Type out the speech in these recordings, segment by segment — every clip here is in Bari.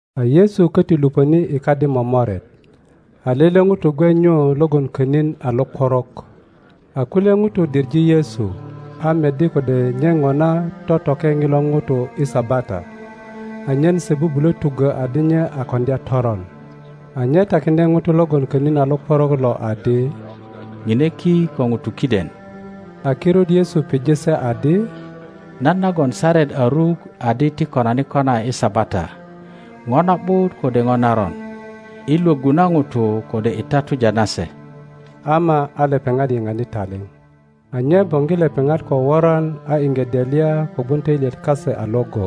A Yesu köti lupöni i kadi momoret, a lele ŋuto gwe nyu logon könin a lokworok. a kulye ŋutu diŋe Yesu, a meddi kode nye ŋona totoke ŋilo ŋuto i Sabata, anyen se bubulö tuggö adi nye a koŋdya toron. A nye takiŋdye ŋuto logon könin a lokworok lo adi, Ŋine ki ko ŋutu kiden. A kirut Yesu pije se adi, Nan nagon saret a ruk adi ti konani kona i Sabata? Ŋo na ’but, kode ŋo naron? I lwöggu na ŋutu kode i tatuja na se? Ama a lepeŋat yiŋani taliŋ. a nye boŋgi lepeŋat ko woran a iŋge delya kogwon töilyet kase a iŋgo,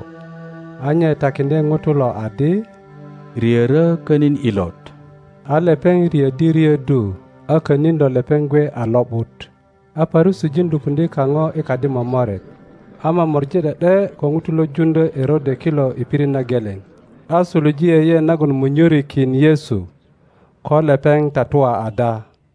a nye takiŋdye ŋuto lo adi, Riörö könin ilot. A lepeŋ riöddi riöddu, a könin lo lepeŋ gwe a lo ’but. A Parusijin lupuŋdye kaŋo i kadi momoret, a momori ’de ’de ko ŋutu lo juŋdyö Erode kilo i pirit na geleŋ, a suluje yeyeet nagon mwönyörikin Yesu, ko lepeŋ tatua ada.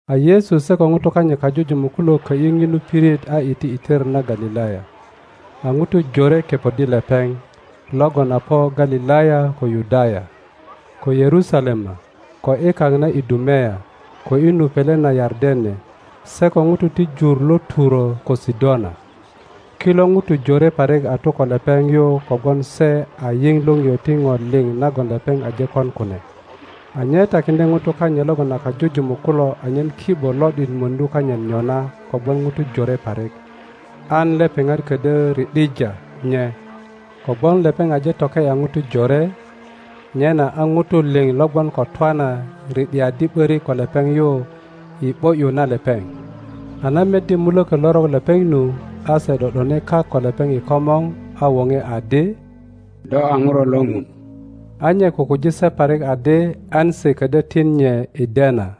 A Yesu se ko ŋutu kanyit kajujumuk kulo kö ’yi ŋinu pirit a iti i tor na Galilaya, a ŋutu jore kepoddi lepeŋ, logon a po Galilaya ko Yudaya, ko Yerusalema, ko i kak na Idumea, ko i nu pele na Yardene, se ko ŋutu ti jur lo Turo ko Sidona. Kilo ŋutu jore parik a tu ko lepeŋ yu kogwon se a yiŋ liŋio ti ŋo liŋ nagon lepeŋ aje kon kune. A nye takiŋdye ŋutu kanyit logon a kajujumuk kulo anyen ki ’bo lo ’dit möŋdu kanyit nyona kogwon ŋutu jore parik, an lepeŋat ködyö ri ’dija nye; kogwon lepeŋ aje toke ’ya ŋutu jore, nyena a ŋutu liŋ lo gwon ko twana ri ’diaddi ’börik ko lepeŋ yu i ’bo ’yu na lepeŋ. A na meddi mulökö lorok lepeŋ nu, a se ’do ’done kak ko lepeŋ i komor, a woŋe adi, Do a Ŋuro lo Ŋun. A nye kukuji se parik adi an se ködyö tin nye i dena.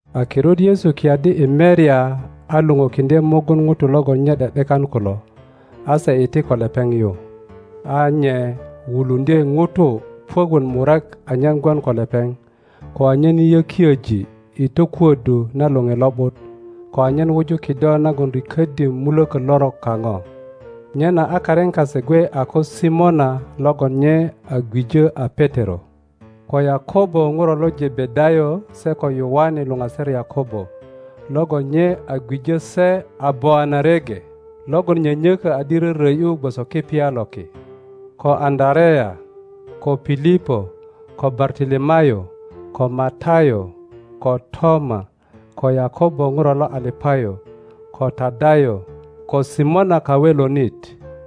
A kirut Yesu kiyaddi i merya a luŋukiŋdye mugun ŋutu logon nye ’de ’dekan kulo; a se iti ko lepeŋ yu. A nye wuluŋdye ŋutu puök wot murek anyen gwon ko lepeŋ, ko anyen yökiöji i tokuöddu na Loŋe Lo ’but, ko anyen wuju kido nagon riköddi mulokö lorok kaŋo. Nyena a karin kase gwe a ko Simona logon nye a gwijö a Petero; ko Yakobo Ŋuro lo Jebedayo se ko Yoane luŋaser Yakobo, logon nye a gwijö se a Boanerege, logon nyönyökö adi rörö ’yu gwoso kipya lo ki; ko Aŋöarea, ko Pilipo, ko Bartolomayo, ko Matayo, ko Toma, ko Yakobo Ŋuro lo Alapayo, ko Tadayo, ko Simona Kawelonit,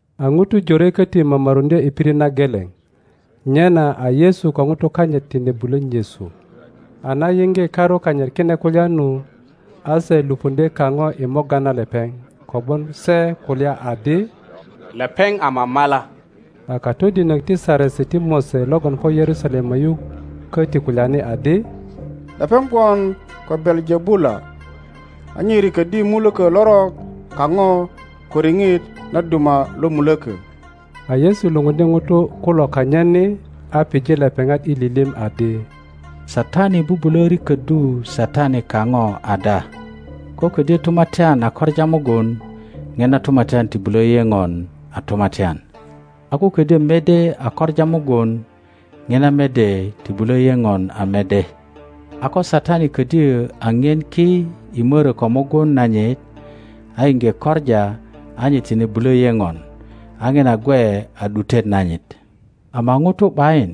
A ŋutu jore köti momoruŋdye i pirit na geleŋ, nyena a Yesu ko ŋutu kanyit tine bulö nyesu. A na yiŋge karu kanyit kine kulya nu, a se lupuŋdye kaŋo i morga na lepeŋ, kogwon se kulya adi, Lepeŋ a mamala. A katodinök ti Saresi ti Mose logon po Yerusalema yu köti kulyani adi, Lepeŋ gwon ko Belejebula, a nye riköddi mulökö lorok kaŋo ko riŋit na duma lo mulökö. a Yesu lupundye ŋutu kulo kanyit ni, a pije lepeŋat i lilim adi, Satani bubulö riköddu Satani kaŋo ada? Ko ködyö tumatyan a koŋa mugun, ŋina tumatyan ti bulö yeŋon a tumatyan. a ko ködyö mede a koŋa mugun, ŋina mede ti bulö yeŋon a mede. A ko Satani ködyö a ŋien ki i mörö ko mugun nanyit, a iŋge koŋa, a nye tine bulö yeŋon, a ŋina gwe a ’dutet nanyit. Ama ŋuto ’bayin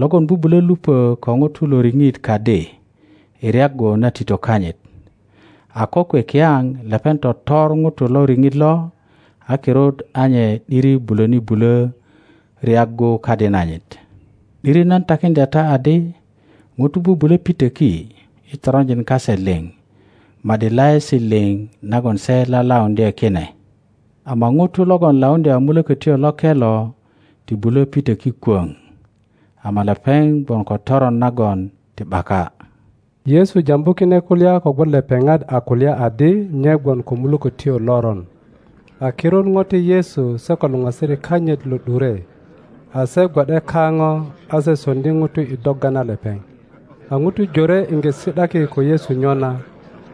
logon bubulö lupö ko ŋuto lo riŋit kadi i ryaggu na tito kanyit, a kokwe kiyaŋ lepeŋ totor ŋuto lo riŋit lo; a kirut a nye ’diri bulöni bulö ryaggu kadi nanyit. ’Diri nan takiŋdya ta adi, ŋutu bubulö pitöki i toronjin kase liŋ ma ’di laesi liŋ nagon se lalauŋdye kine; ama ŋuto logon lauŋdya Mulökötyo Loke lo ti bulö pitöki kwöŋ, ama lepeŋ gwon ko toron nagon ti ’baka. Yesu jambu kine kulya kogwon lepeŋat a kulya adi nye gwon ko mulökötyo loron. A kirut ŋote Yesu se ko luŋasirik kanyit lo ’dure; a se gwo ’de kaŋo, a se soŋdi ŋuto i dogga na lepeŋ. a ŋutu jore iŋge si ’daki ko Yesu nyona,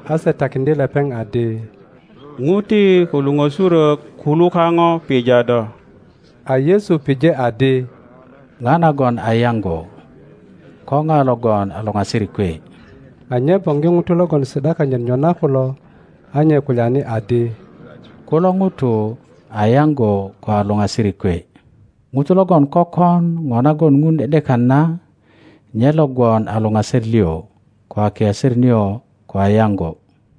a se takiŋdye lepeŋ adi, Ŋuti ko luŋösurök kulu kaŋo pija do. a Yesu pije adi, Ŋa nagon a yaŋgo? Ko ŋa logon a luŋasirik kwe? a nye boŋgi ŋutu logon si ’da kanyit nyona kulo, a nye kulyani adi, Kulo ŋutu a yaŋgo ko a luŋasirik kwe! ŋuto logon kökon ŋo nagon Ŋun ’de ’dekan na, nye lo gwon a luŋaser lio, ko a kiaser nio, ko a yaŋgo.